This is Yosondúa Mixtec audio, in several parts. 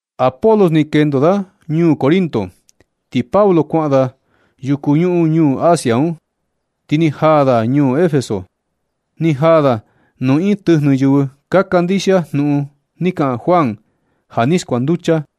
Apolos ni kendo da ñuu Corinto, ti Pablo kuaꞌan da yuku ñuhún ñuu Asia un, ti ni jaa da ñuu Efeso. Ni jaa da nuu iin tɨjnɨ yɨvɨ ka kandixia jnuꞌun ni kaꞌan Juan ja ni skuanducha.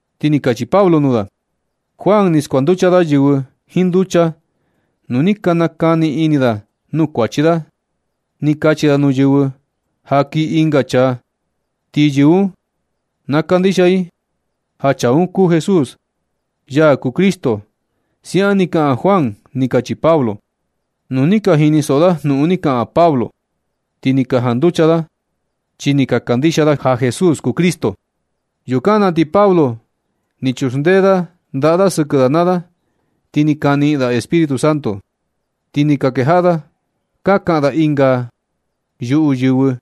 Ti ni kachi Pablo nuu da: ―Juan ni skuanducha da yɨvɨ jiin nducha nu ni ka nakani ini da nuu kuachi da. Ni kachi da nuu yɨvɨ ja kii ɨnga chaa, ti yɨvɨ un na kandixia i ja chaa un kuu Jesús, ya kuu Cristo. Siaꞌan ni kaꞌan Juan ―ni kachi Pablo. Nu ni ka jinisoꞌo da jnuꞌun ni kaꞌan Pablo, ti ni ka janducha da, chi ni ka kandixia da ja Jesús kuu Cristo. Yukan na ti Pablo ni chuxndee da ndaꞌa da sɨkɨ da naa da, ti ni ka niꞌin da Espíritu Santo, ti ni ka kejaꞌa da ka kaꞌan da ɨnga yuꞌu yɨvɨ,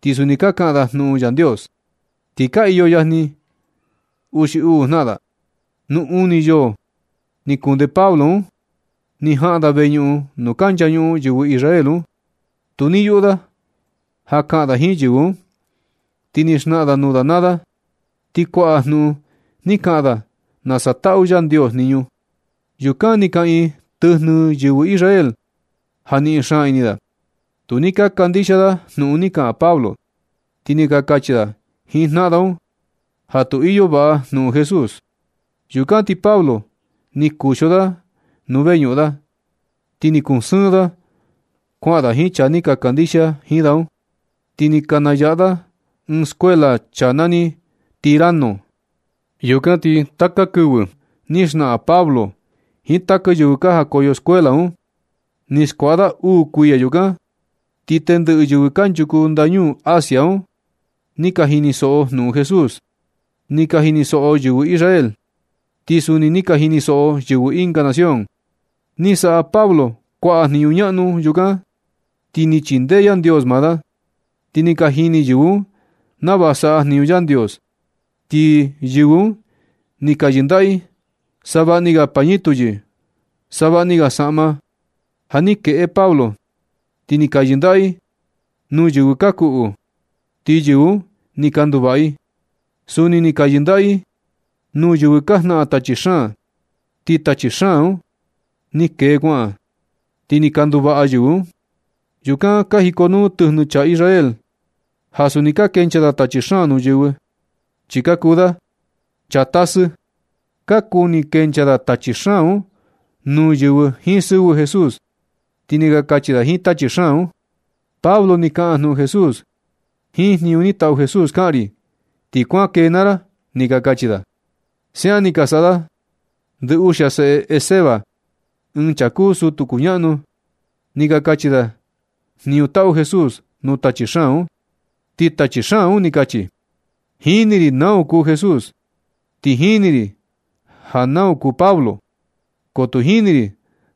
ti suni ka kaꞌan da jnuꞌun Yandios. Ti ka iyo yajni uxi uu jnaꞌan da. Nu uni yoo ni kunde Pablo un, ni jaꞌan da veñuꞌun nuu ka nchañuꞌun yɨvɨ Israel un. Tu ni yuꞌu da ja kaꞌan da jiin yɨvɨ un, ti ni xnaꞌan da nuu da naa da, ti kuaꞌa jnuꞌun ni kaꞌan da nasa taꞌu Yandios jniñu. Yukan ni kaꞌiin tɨjnɨ yɨvɨ Israel ja niꞌin xaan ini da. Tu ni ka kandixia da jnuꞌun ni kaꞌan Pablo. Ti ni ka kachi da jiin jnaꞌan da un ja tu iyo vaꞌa jnuꞌun Jesús. Yukan ti Pablo ni kuxio da nuu veꞌnuꞌun da, ti ni kuu sɨɨn da kuaꞌan da jiin chaa ni ka kandixia jiin da un. Ti ni nayaꞌa da ɨɨn skuela chaa nani Tiranno. Yukan ti taka kɨvɨ ni xnaꞌan Pablo jiin taka yɨvɨ ka jakoyo skuela un. Ni skuaꞌa da uu kuiya yukan. Ti tendɨꞌɨ yɨvɨ kanchuku ndañuu Asia un ni ka jinisoꞌo i jnuꞌun Jesús. Ni ka jinisoꞌo yɨvɨ Israel, ti suni ni ka jinisoꞌo yɨvɨ ɨnga nación. Ni saꞌa Pablo kuaꞌa jniñu ñaꞌnu yukan, chi ni chindee Yandios maa da, ti ni ka jini yɨvɨ un nava saꞌa jniñu Yandios. Ti yɨvɨ un ni ka yɨndaꞌa i savaꞌni ga pañitu xi savaꞌni ga saꞌma, ja ni kueꞌe Pablo, ti ni ka yɨndaꞌa i nuu yɨvɨ ka kuꞌu, ti yɨvɨ un ni ka nduvaꞌa i. Suni ni ka yɨndaꞌa i nuu yɨvɨ ka jnaꞌan tachi xaan, ti tachi xaan un ni kee kuaꞌan, ti ni ka nduvaꞌa yɨvɨ un. Yukan ka jikonuu tɨjnɨ chaa Israel ja suni ka kenchaa da tachi xaan nuu yɨvɨ, chi ka kuu da chaa tasɨ. Ka kuni kenchaa da tachi xaan un nuu yɨvɨ jiin sɨvɨ Jesús, ti ni ka kachi da jiin tachi xaan un: ―Pablo ni kaꞌan jnuꞌun Jesús. Jiin jniñu ni taꞌu Jesús kaꞌan ri, ti kuan kee naa ra ―ni ka kachi da. Siaꞌan ni ka saꞌa ndɨ uxia seꞌe Esceva, ɨɨn chaa kuu sutu kuñaꞌnu. Ni ka kachi da jniñu taꞌu Jesús nuu tachi xaan un, ti tachi xaan un ni ka kachi: ―Jini ri nau ja kuu Jesús, ti jini ri nau ja kuu Pablo, ko tu jini ri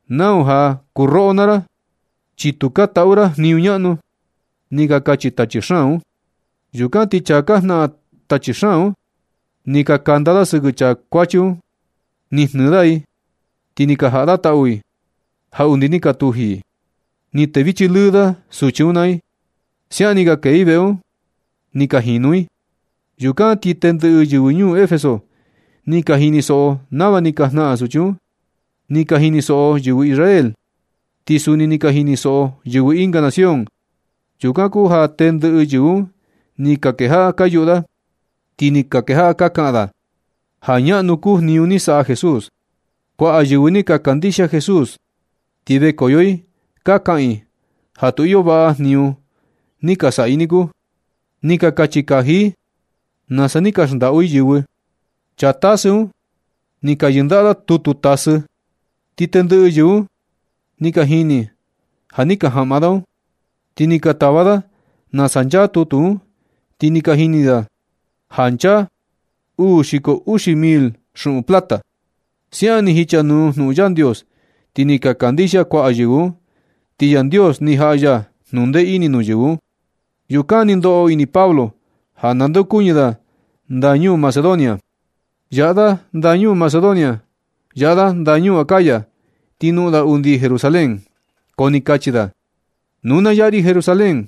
nau ja kuu roꞌo naa ra, chi tu ka taꞌu ra jniñu ñaꞌnu ―ni ka kachi tachi xaan un. Yukan ti chaa ka jnaꞌan tachi xaan un, ni kanda da sɨkɨ chaa kuachi un ni jnɨɨ da i, ti ni jaꞌa da tau i ja undi ni ka tuji i. Ni tevichi lɨɨ da suchi un naa i. Siaꞌan ni ka kee i veꞌe un, ni ka jinu i. Yukan ti tendɨꞌɨ yɨvɨ ñuu Efeso ni ka jinisoꞌo nava ni ka jnaꞌan suchi un. Ni ka jinisoꞌo yɨvɨ Israel, ti suni ni ka jinisoꞌo yɨvɨ ɨnga nación. Yukan kuu ja tendɨꞌɨ yɨvɨ un ni ka kejaꞌa ka yuꞌu da, ti ni ka kejaꞌa ka kaꞌan da ja ñaꞌnu kuu jniñu ni saꞌa Jesús. Kuaꞌa yɨvɨ ni ka kandixia Jesús, ti vekoyo i ka kaꞌan i ja tu iyo vaꞌa jniñu ni ka saꞌa i niku. Ni ka kachi kaji i nasa ni ka xndaꞌu i yɨvɨ. Chaa tasɨ un ni ka yɨndaꞌa da tutu tasɨ, ti tendɨꞌɨ yɨvɨ un ni ka jini ja ni ka jaꞌma da un. Ti ni ka tava da nasa nchaa tutu un, ti ni ka jini da ja nchaa uu xiko uxi mil xuꞌun plata. Siaꞌan ni jichanuu jnuꞌun Yandios, ti ni ka kandixia kuaꞌa yɨvɨ un, ti Yandios ni jaꞌa ya jnundee ini nuu yɨvɨ un. Yukan ni ndoꞌo ini Pablo ja nandeokuñɨ da ndañuu Macedonia. Yaꞌa da ndañuu Macedonia. Yaꞌa da ndañuu Acaya, ti noꞌon da undi Jerusalén, ko ni kachi da: ―Nu na yaꞌa ri Jerusalén,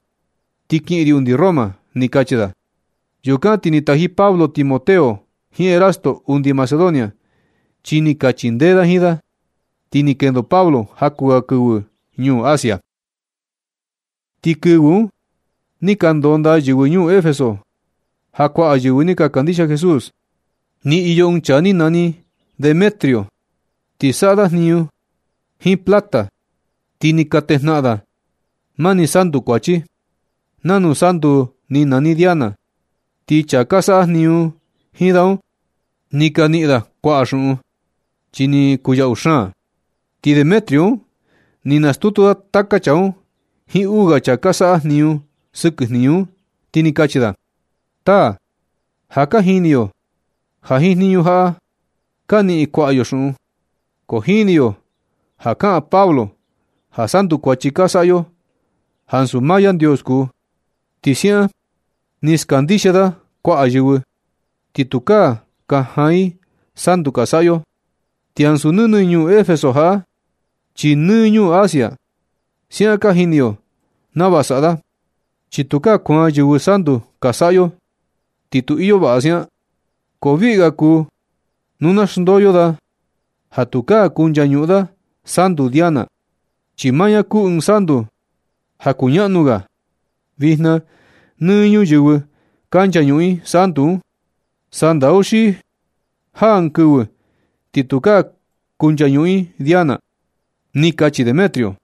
ti kiꞌin ri undi Roma ―ni kachi da. Yukan ti ni taji Pablo Timoteo jiin Erasto undi Macedonia, chi ni ka chindee da jiin da, ti ni kendo Pablo jaku ga kɨvɨ ñuu Asia. Ti kɨvɨ un ni ka ndondaa yɨvɨ ñuu Efeso, ja kuaꞌa yɨvɨ ni ka kandixia Jesús. Ni iyo ɨɨn chaa ni nani Demetrio. Ni saꞌa da jniñu jiin plata, ti ni ka natejnaꞌan da mani santu kuachi. Nanu santu ni nani Diana. Ti chaa ka saꞌa jniñu jiin da un, ni ka niꞌin kuaꞌa da xuꞌun, chi ni kuu yaꞌu xaan. Ti Demetrio un ni nastutu da taka chaa un jiin uu ga chaa ka saꞌa jniñu sɨkɨ jniñu un, ti ni kachi da: ―Taa, ja ka jini yo ja jiin jniñu jaꞌa ka niꞌin kuaꞌa yo xuꞌun. Ko jini yo ja kaꞌan Pablo ja santu kuachi ka saꞌa yo, ansu maa Yandios kuu. Ti siaꞌan ni skandixia da kuaꞌa yɨvɨ, ti tukaa ka jaan i santu ka saꞌa yo. Ti ansu nɨnɨ ñuu Efeso jaꞌa, chi nɨ ñuu Asia. Siaꞌan ka jini yo nava saꞌa da. Chi nu tukaa kuaan yɨvɨ santu ka saꞌa yo, ti tu iyo vaꞌa nu siaꞌan, ko viꞌi ga kuu nu na xndoo da ja tukaa kunchañuꞌun da santu Diana, chi maa ña kuu ɨɨn santu ja kuu ñaꞌnu ga. Vijna nɨ ñuyɨvɨ ka nchañuꞌun i santu un. Sandau xi jaa ɨɨn kɨvɨ ti tukaa kunchañuꞌun i Diana ―ni kachi Demetrio.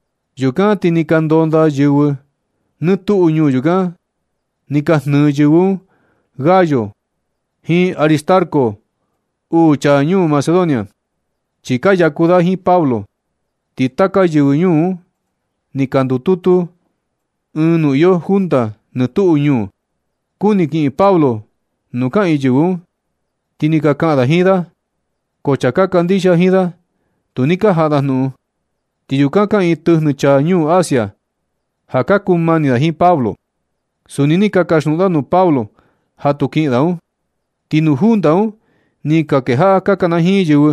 Yukan ti ni ka ndondaa yɨvɨ nɨ tuꞌu ñuu yukan, ni ka jnɨ yɨvɨ un Gayo jiin Aristarco, uu chaa ñuu Macedonia, chi ka yaku da jiin Pablo. Ti taka yɨvɨ ñuu un ni ka ndututu ɨɨn nuu iyo junta nɨ tuꞌu ñuu. Kuni kiꞌin Pablo nuu ka kanajiin yɨvɨ un, ti ni ka kaꞌan da jiin da, ko chaa ka kandixia jiin da tu ni ka jaꞌa da jnuꞌun. Ti yukan kaꞌiin tɨjnɨ chaa ñuu Asia, ja ka kuu mani da jiin Pablo. Suni ni ka kasjnuꞌun da nuu Pablo ja tu kiꞌin da un. Ti nuu junta un ni ka kejaꞌa ka kanajiin yɨvɨ.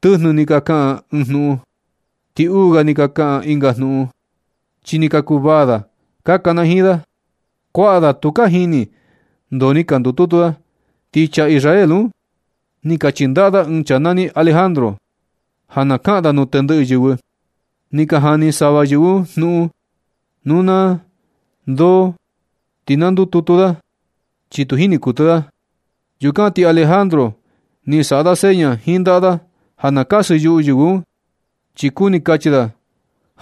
Tɨjnɨ ni ka kaꞌan ɨɨn jnuꞌun, ti uu ga ni ka kaꞌan ɨnga jnuꞌun, chi ni ka kuvaa da ka kanajiin da. Kuaꞌa da tu ka jini ndoo ni ka ndututu da. Ti chaa Israel un ni ka chindaꞌa da ɨɨn chaa nani Alejandro, ja na kaꞌan da nuu tendɨꞌɨ yɨvɨ, ni ka jani sava yɨvɨ un jnuꞌun nuu da ndoo ni ka ndututu da, chi tu jini kuɨtɨ da. Yukan ti Alejandro ni saꞌa da seña jiin ndaꞌa da ja na kasɨyuꞌu yɨvɨ un, chi kuni kachi da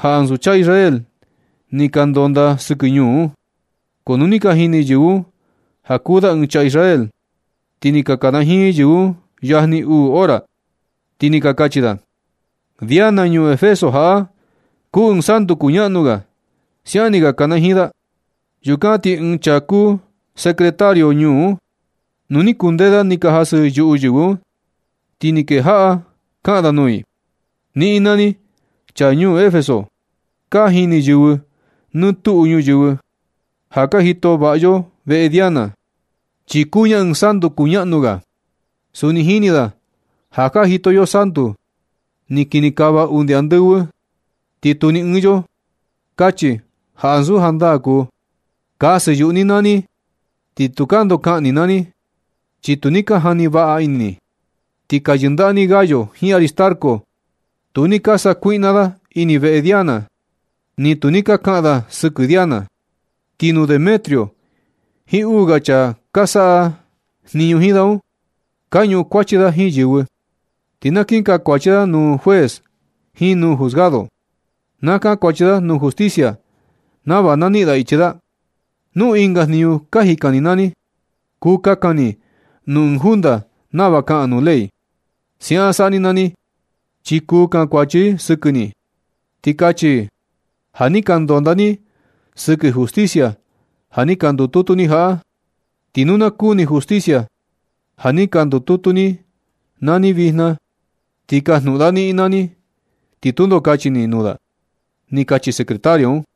ja ansu chaa Israel ni ka ndondaa sɨkɨ ñuu un. Ko nu ni ka jini yɨvɨ un ja kuu da ɨɨn chaa Israel, ti ni ka kanajiin yɨvɨ un yajni uu hora, ti ni ka kachi da: ―Diana, ñuu Efeso jaꞌa, kuu ɨɨn santu kuñaꞌnu ga ―siaꞌan ni ka kana jiin da. Yukan ti ɨɨn chaa kuu secretario ñuu un, nu ni kundee da ni ka jasɨyuꞌu yɨvɨ un, ti ni kejaꞌa kaꞌan da nuu i: ―Niꞌin naa ni chaa ñuu Efeso, ka jini yɨvɨ nɨ tuꞌu ñuyɨvɨ ja ka jito vaꞌa yo veꞌe Diana, chi kuu ña ɨɨn santu kuñaꞌnu ga. Suni jini da ja ka jito yo santu ni kinikava undi andɨvɨ. Ti tu ni ɨɨn yo kachi ja ansu jandaa kuu. Kasɨ yuꞌu ni naa ni. Ti tukaa ndoo kaꞌan ni naa ni, chi tu ni ka jani vaꞌa ini ni. Ti ka yɨndaꞌa ni Gayo jiin Aristarco. Tu ni ka sakuiꞌna da ini veꞌe Diana, ni tu ka kaꞌan da sɨkɨ Diana. Ti nuu Demetrio jiin uu ga chaa ka saꞌa jniñu jiin da un, ka ñuꞌun kuachi da jiin yɨvɨ, ti na kin kankuachi da nuu juez jiin nuu juzgado, na kankuachi da nuu justicia nava na niꞌin da ichi da. Nu ɨnga jniñu ka jikan ni naa ni, kuu kakan ni nuu ɨɨn junta nava kaꞌan nuu ley. Siaꞌan saꞌa ni naa ni, chi kuu kankuachi i sɨkɨ ni, ti kachi i ja ni ka ndondaa ni naa ni sɨkɨ justicia ja ni ka ndututu ni jaꞌa. Ti nu na kuni justicia ja ni ka ndututu ni naa ni vijna, ti kajnuꞌun da niꞌin naa ni, ti tundo kachi ni nuu da ―ni kachi secretario un.